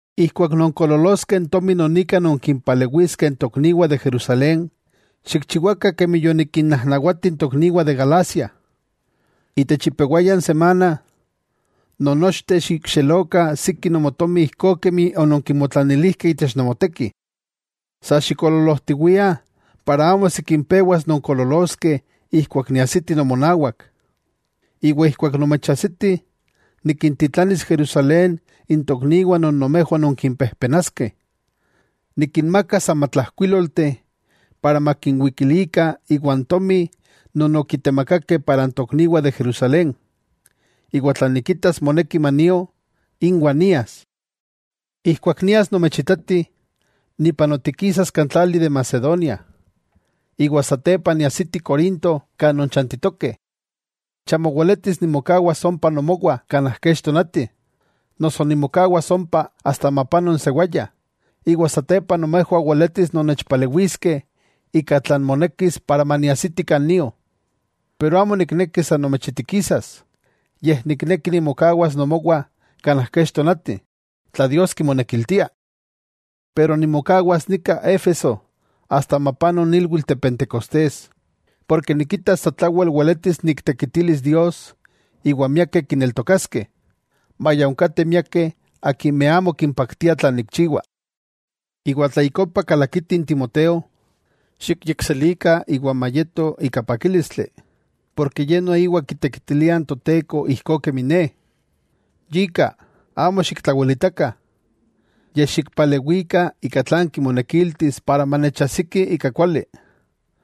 Ijkuak nonkoololoskeh n tomi non ika nonkimpalewiskeh n tokniwah de Jerusalén, xikchiwakah kemi yonikinnajnawati n tokniwah de Galacia. Itech ipewaya n semana, nonnochteh xikxelokah siki nomotomi ijkó kemi ononkimotlanilijkeh itech nomoteki. Sa xikoololojtiwiah para amo sikin pewas nonkoololoskeh ijkuak niajsiti nomonawak. Iwa ijkuak nomechajsiti, nikintitlanis Jerusalén n tokniwah non nomejwah nonkimpejpenaskeh. Nikinmakas amatlajkuílolteh, para makinwikilikah iwan tomi non okitemakakeh para n tokniwah de Jerusalén. Iwa tla nikitas moneki manio, inwah nias. Ijkuak nias nomechitati, nipanotikisas kan tlali de Macedonia, iwa satepa niajsiti Corinto kan nonchantitokeh. Chamo weletis nimokawas ompa nomowah kanaj kech tonati, noso nimokawas ompa asta mapano n sewaya, iwa satepa nomejwah weletis nonnechpalewiskeh ika tlan monekis para maniajsiti kan nio. Pero amo nikneki san nomechitikisas, yej nikneki nimokawas nomowah kanaj kech tonati, tla Dios kimonekiltia. Pero nimokawas nika Éfeso asta mapano n ilwitl de Pentecostés, porke nikita sa tlawel weletis niktekitilis Dios iwa miakeh kineltokaskeh, maya onkateh miakeh akimeh amo kimpaktia tlan nikchiwa. Iwa tla ik ompa kalakiti n Timoteo, xikyekselikah iwa mayeto ika pakílistli, porke ye noiwa kitekitilia n Toteko ijkó kemi ne. Yika, amo xiktlawelitakah, yej xikpalewikah ika tlan kimonekiltis para manechajsiki ika kuali,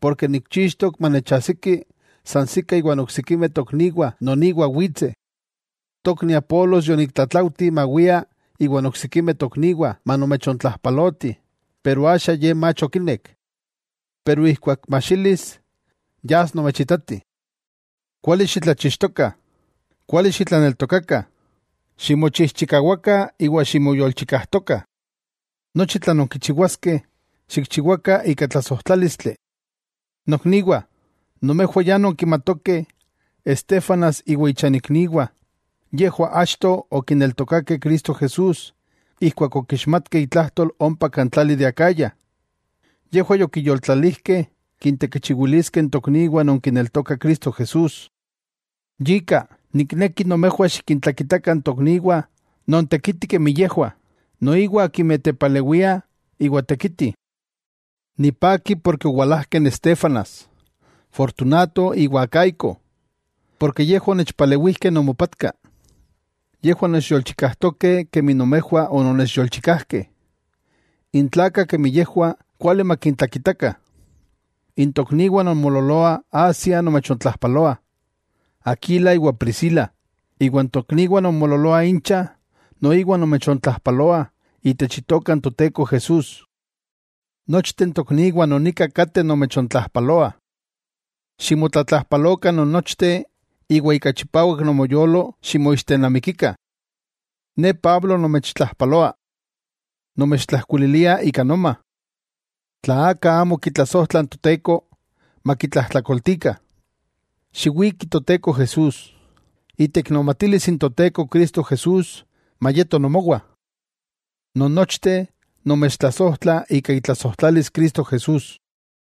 porke nikchixtok manechajsiki sansikah iwa oksikimeh tokniwah non iwa witseh. Tokni Apolos yoniktlatlaujti mawia iwan oksikimeh tokniwah manomechontlajpalotih, pero axa ye mach okinek. Pero ijkuak majxilis, yas nomechitati. Kuali xitlachixtokah, kuali xitlaneltokakah, ximochijchikawakah iwa ximoyolchikajtokah. Nochi tlan nonkichiwaskeh, xikchiwakah ika tlasojtlálistli. Nokniwah, nomejwah ya nonkimatokeh Estéfanas iwan ichanikniwah, yejwah achto okineltokakeh Cristo Jesús ijkuak okixmatkeh itlajtol ompa kan tlali de Acaya. Yejwah yokiyoltlalijkeh kintekichiwiliskeh n tokniwah non kineltokah Cristo Jesús. Yika, nikneki nomejwah xikintlakitakah n tokniwah nontekitih kemi yejwah, noiwa akimeh tepalewiah iwa tekitih. Nipaki porke owalajkeh n Estéfanas, Fortunato iwa Acaico. Porke yejwah onechpalewijkeh nomopatka. Yejwah nechyolchikajtokeh kemi nomejwah onomechyolchikajkeh. N tlakah kemi yejwah kuali matikintlakitakah. N tokniwah non moololoah Asia nomechontlajpaloah. Aquila iwa Priscila, iwa n tokniwah non moololoah incha, noiwa nomechontlajpaloah itech Itoka n Toteko Jesús. Nochteh n tokniwah non nika kateh nomechontlajpaloah. Ximotlatlajpalokah non nochteh iwa ika chipawak nomoyolo ximoixtenamikikah. Ne Pablo nomechtlajpaloa. Nomechtlajkuililia ika noma. Tla aka amo kitlasojtla n Toteko, makitlajtlakoltikah. ¡Xiwiki Toteko Jesús! Iteiknomatilis n Toteko Cristo Jesús mayeto nomowah. Nonnochteh nomechtlasojtla ika itlasojtlalis Cristo Jesús.